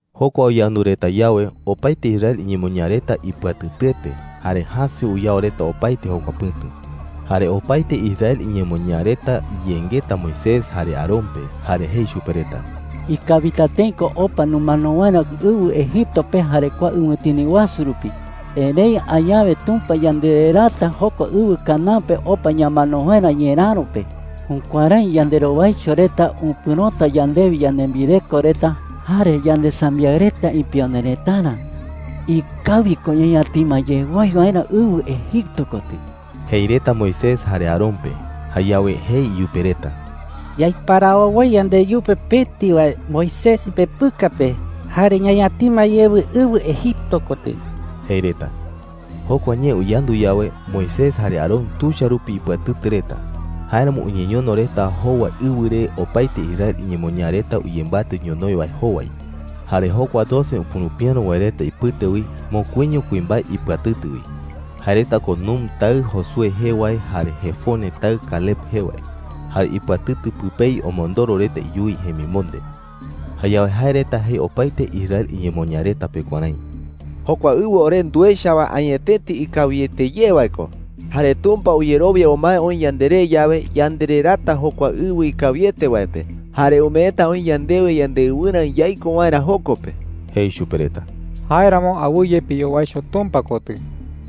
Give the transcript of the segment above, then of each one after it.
Jokua uyandu reta yawe, opaete Israel iñemoñaa reta ipɨatɨtɨete, jare jäse uyao reta opaete jokua pɨ̈tu. Jare opaete Israel iñemoñaa reta iyengeta Moisés jare Aarón pe, jare jei chupe reta: “¡Ikawita tëi ko opa numano waerä ɨwɨ Egipto pe jare kua ɨwɨtini wasu rupi!” jei reta. “¡Erëi añawe Tumpa yandereraata jokua ɨwɨ Canaán pe opa ñamano waerä ñeräro pe! ¡Jukuärái yanderowaicho reta upɨ̈rota yandewi yanembireko reta jare yandesambiaɨ reta ipione retarä! ¡Ikawi ko ñañatima ye woi waerä ɨwɨ Egipto kotɨ!” jei reta Moisés jare Aarón pe. Jayawe jei iyupe reta: “Yaiparawo woi yandeyupe pëti wae Moisés ipepɨka pe, jare ñañatima yewɨ ɨwɨ Egipto kotɨ,” jei reta. Jokua ñee uyandu yawe, Moisés jare Aarón tuicha rupi ipɨatɨtɨ reta. Jáeramo uñeñono reta jowa ɨwɨ re opaete Israel iñemoñaa reta uyembatɨ ñonoï wae jowai. Jare jokua doce upurupiäro wae reta ipɨte wi, mokuiño kuimbae ipɨatɨtɨ wi. Jae reta ko Nun taɨ Josué jee wae jare Jefone taɨ Caleb jee wae. Jare ipɨatɨtɨ pɨpei omondoro reta iyuwi jemimonde. Jayawe jae reta jei opaete Israel iñemoñaa reta pe kuärái: “Jokua ɨwɨ ore nduecha wae añetete ikawiete ye wae ko. Jare Tumpa uyerowia umae oï yanderé yawe, yandereraata jokua ɨwɨ ikawiete wae pe, jare umeeta oï yandewe yandeɨwɨrä yaiko waerä joko pe,” jei chupe reta. “Jáeramo awɨye piyowaicho Tumpa kotɨ,” jei.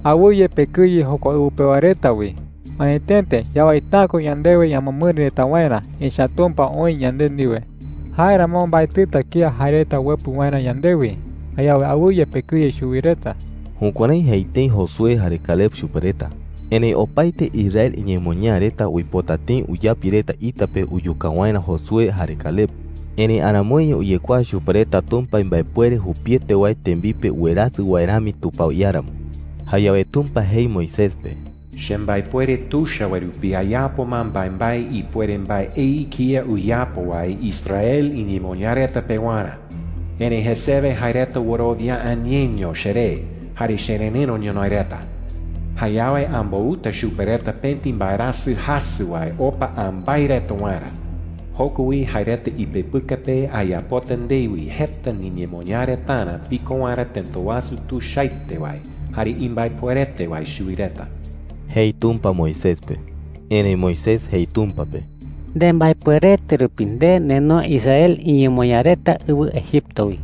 “Awɨye pekɨye jokua ɨwɨ pewa reta wi. Añetete yawaita’ä ko yandewe ñamɨamɨri reta waerä, echa’ä Tumpa oï yande ndiwe,” jei. “Jáeramo mbaetɨta kía jae reta uepɨ waerä yandewi. Jayawe awɨye pekɨye chuwi reta.” Jukuärái jei tëi Josué jare Caleb chupe reta. Erëi opaete Israel iñemoñaa reta uipota tëi uyapi reta ita pe uyuka waerä Josué jare Caleb. Erëi aramoiño uyekuaa chupe reta Tumpa imbaepuere jupiete wae tembipe uwerasɨ wae rami tupao iáramo. Jayawe Tumpa jei Moisés pe: “Chembaepuere tuicha wae rupi ayapo ma mbaembae ipuere mbaei kía uyapo wae Israel iñemoñaa reta pewarä. Erëi jesewe jae reta wɨrowia’ä ñeño cheré jare chererɨ̈ro ñonoï reta. Jayawe ambouta chupe reta pëti mbaerasɨ jasɨ wae opa ambái reta waerä. Joko wi jae reta ipepɨka pe ayapota ndewi jeta niñemoñaa retarä piko waerä tëta wasu tuichaete wae jare imbaepuerete wae chuwi reta,” jei Tumpa Moisés pe. Erëi Moisés jei Tumpa pe: “Nembaepuerete rupi nde nenoe Israel iñemoñaa reta ɨwɨ Egipto wi,”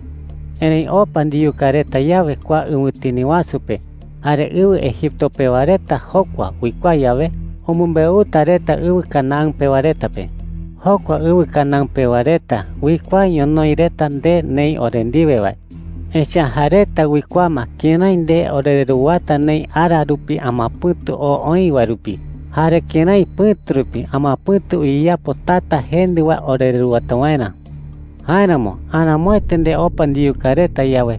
jei. “Erëi opa ndiyuka reta yawe kua ɨwɨtini wasu pe, jare ɨwɨ Egipto pewa reta jokua uikuaa yawe, umɨmbeuta reta ɨwɨ Canaán pewa reta pe,” jei. “Jokua ɨwɨ Canaán pewa reta uikuaa ñonoï reta nde neï ore ndiwe wae. Echa’ä jae reta uikuaa ma kërái nde orereruwata neï ara rupi amapɨ̈tu oo oï wae rupi, jare kërái pɨ̈tu rupi amapɨ̈tu uyeyapo tata jendɨ wae orereruwata waerä,” jei. “Jáeramo aramoete nde opa ndiyuka reta yawe,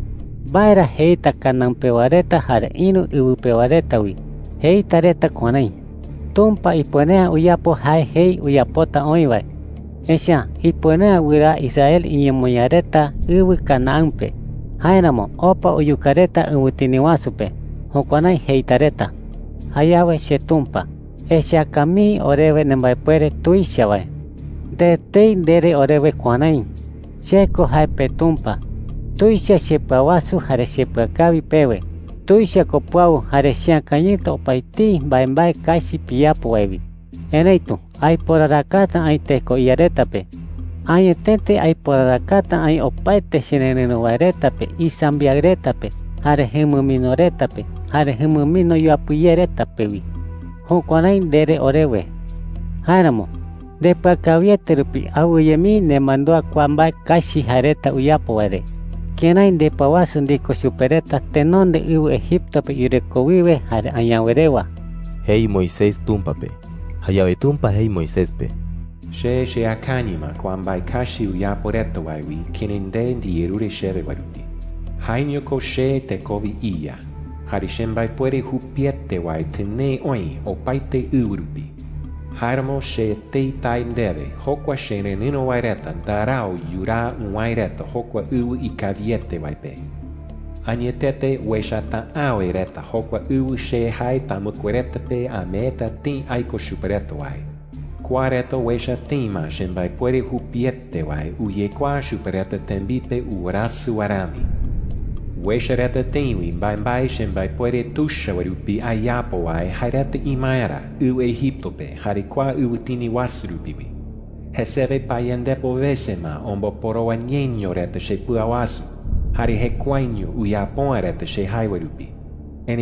¿mbae ra jeita Canaán pewa reta jare ïru ɨwɨ pewa reta wi? Jeita reta kuärái: ‘Tumpa ipuere’ä uyapo jae jei uyapota oï wae, echa’ä ipuere’ä wɨraa Israel iñemoñaa reta ɨwɨ Canaán pe. Jáeramo opa uyuka reta ɨwɨtini wasu pe.’ Jukuärái jeita reta,” jei chupe. “Jayawe cheTumpa, echaka mii orewe nembaepuere tuicha wae,” jei. “Nde etei ndere orewe kuärái: ‘Che ko jae peTumpa. Tuicha chepɨawasu jare chepɨakawi pewe. Tuicha ko puau jare cheakañɨta opaetei mbaembae kachi piyapo wae wi. Erëitu aiporarakata aï teko iya reta pe. Añetete aiporarakata aï opaete chererɨ̈ro wae reta pe, isambiaɨ reta pe, jare jumɨmino reta pe, jare jumɨmino yuapɨ ye reta pe wi.’ Jukuärái ndere orewe,” jei. “Jáeramo, ndepɨakawiete rupi awɨye mii nemandúa kua mbae kachi jae reta uyapo wae re, kërái ndepɨawasu ndiko chupe reta tenonde ɨwɨ Egipto pe yureko wiwe jare añawe rewa,” jei Moisés Tumpa pe. Jayawe Tumpa jei Moisés pe: “Che cheakañɨ ma kua mbae kachi uyapo reta wae wi kërái nde ndiyerure chewe wae rupi,” jei chupe. “Jaeño ko che tekowe iYa, jare chembaepuere jupiete wae tɨnee oï opaete ɨwɨ rupi. Jáeramo che etei tae ndewe, jokua chererɨ̈ro wae reta ndarau yuraa uwäe reta jokua ɨwɨ ikawiete wae pe. Añetete uechata’äwe reta jokua ɨwɨ che jae tamɨkue reta pe ameeta tëi aiko chupe reta wae. Kua reta uecha tëi ma chembaepuere jupiete wae uyekuaa chupe reta tembipe uwerasɨ wae rami. Uecha reta tëi wi mbaembae chembaepuere tuicha wae rupi ayapo wae jae reta imaerä ɨwɨ Egipto pe jare kua ɨwɨtini wasu rupi wi. Jesewe payandepo wese ma omboporowa ñeño reta chepɨawasu, jare jekuaeño uyapo’ä reta che jae wae rupi,” jei chupe.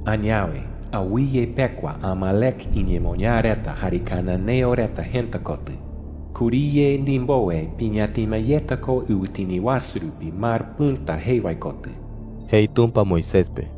“Añawe, awɨye pekua Amalec iñemoñaa reta jare cananeo reta jëta kotɨ. Kuriye ndimbowe piñatima yeta ko ɨwɨtini wasu rupi Mar Pɨ̈ta jee wae kotɨ,” jei Tumpa Moisés pe.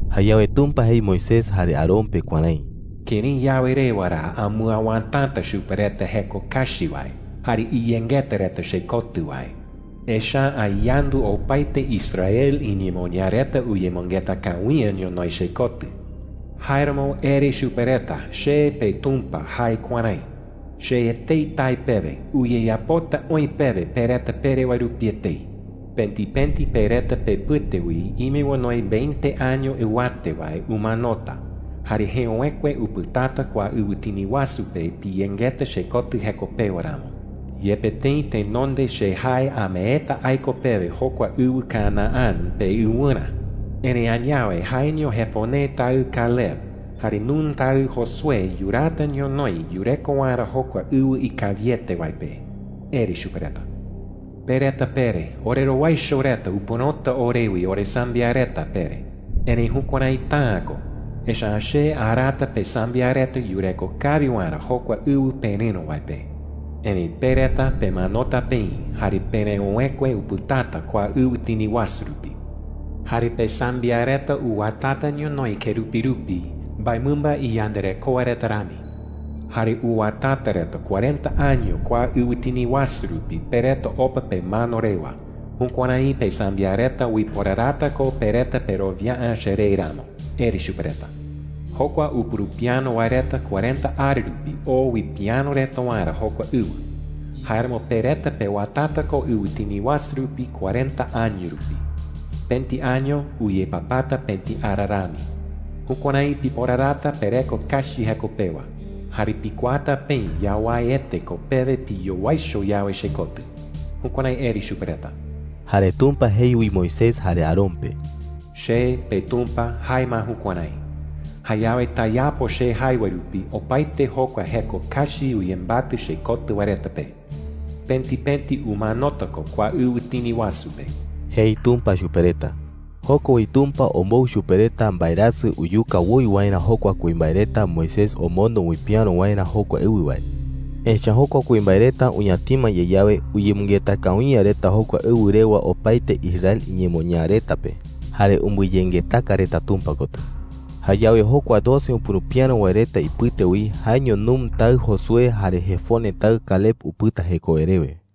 Jayawe Tumpa jei Moisés jare Aarón pe kuärái: “¿Kërái yawe rewa ra amɨawätata chupe reta jeko kachi wae jare iyengeta reta chekotɨ wae?” jei. “Echa’ä ayandu opaete Israel iñemoñaa reta uyemɨngeta kawi’ä ñonoï chekotɨ. Jáeramo ere chupe reta che, peTumpa, jae kuärái: ‘Che etei tae pewe, uyeyapota oï pewe pe reta pere wae rupi etei. Pëti pëti pe reta pepɨte wi ime onoi veinte año ɨwate wae umanota jare jeöwekue upɨtata kua ɨwɨtini wasu pe, piyengeta chekotɨ jeko pewa ramo. Yepe tëi tenonde che jae ameeta aiko pewe jokua ɨwɨ Canaán peɨwɨrä, erëi añawe jaeño Jefone taɨ Caleb jare Nun taɨ Josué yuraata ñonoï yureko waerä jokua ɨwɨ ikawiete wae pe,’ ere chupe reta. ‘Pe reta pere: ‘Orerowaicho reta upɨ̈rota orewi oresambiaɨ reta,’ pere. Erëi jukuäraita’ä ko, echa’ä che araata pesambiaɨ reta yureko kawi waerä jokua ɨwɨ perɨ̈ro wae pe. Erëi pe reta pemanota peï jare pereöwekue upɨtata kua ɨwɨtini wasu rupi. Jare pesambiaɨ reta uwatata ñonoï kerupi rupi mbaemɨmba iyandarekoa reta rami, jare uwatata reta cuarenta año kua ɨwɨtini wasu rupi pe reta opa pemano rewa. Jukuärái pesambiaɨ reta uiporarata ko pe reta perowia’ä cheré ramo,’ ere chupe reta. ‘Jokua upurupiäro wae reta cuarenta ara rupi oo uipiäro reta waerä jokua ɨwɨ. Jáeramo pe reta pewatata ko ɨwɨtini wasu rupi cuarenta año rupi. Pëti año uyepapata pëti ara rami. Jukuärái piporarata pereko kachi jeko pewa, jare pikuaata peï yawaiete ko pewe piyowaicho yawe chekotɨ.’ Jukuärái ere chupe reta.” Jare Tumpa jei wi Moisés jare Aarón pe: “Che, peTumpa, jae ma jukuärái. Jayawe tayapo che jae wae rupi opaete jokua jeko kachi uyembatɨ chekotɨ wae reta pe. Pëti pëti umanota ko kua ɨwɨtini wasu pe,” jei Tumpa chupe reta. Joko wi Tumpa ombou chupe reta mbaerasɨ uyuka woi waerä jokua kuimbae reta Moisés omondo uipiäro waerä jokua ɨwɨ wae. Echa’ä jokua kuimbae reta uñatima ye yawe, uyemɨngeta kawi’ä reta jokua ɨwɨ rewa opaete Israel iñemoñaa reta pe, jare umbɨyengetaka reta Tumpa kotɨ. Jayawe jokua doce upurupiäro wae reta ipɨte wi, jaeño Nun taɨ Josué jare Jefone taɨ Caleb upɨta jekowe rewe.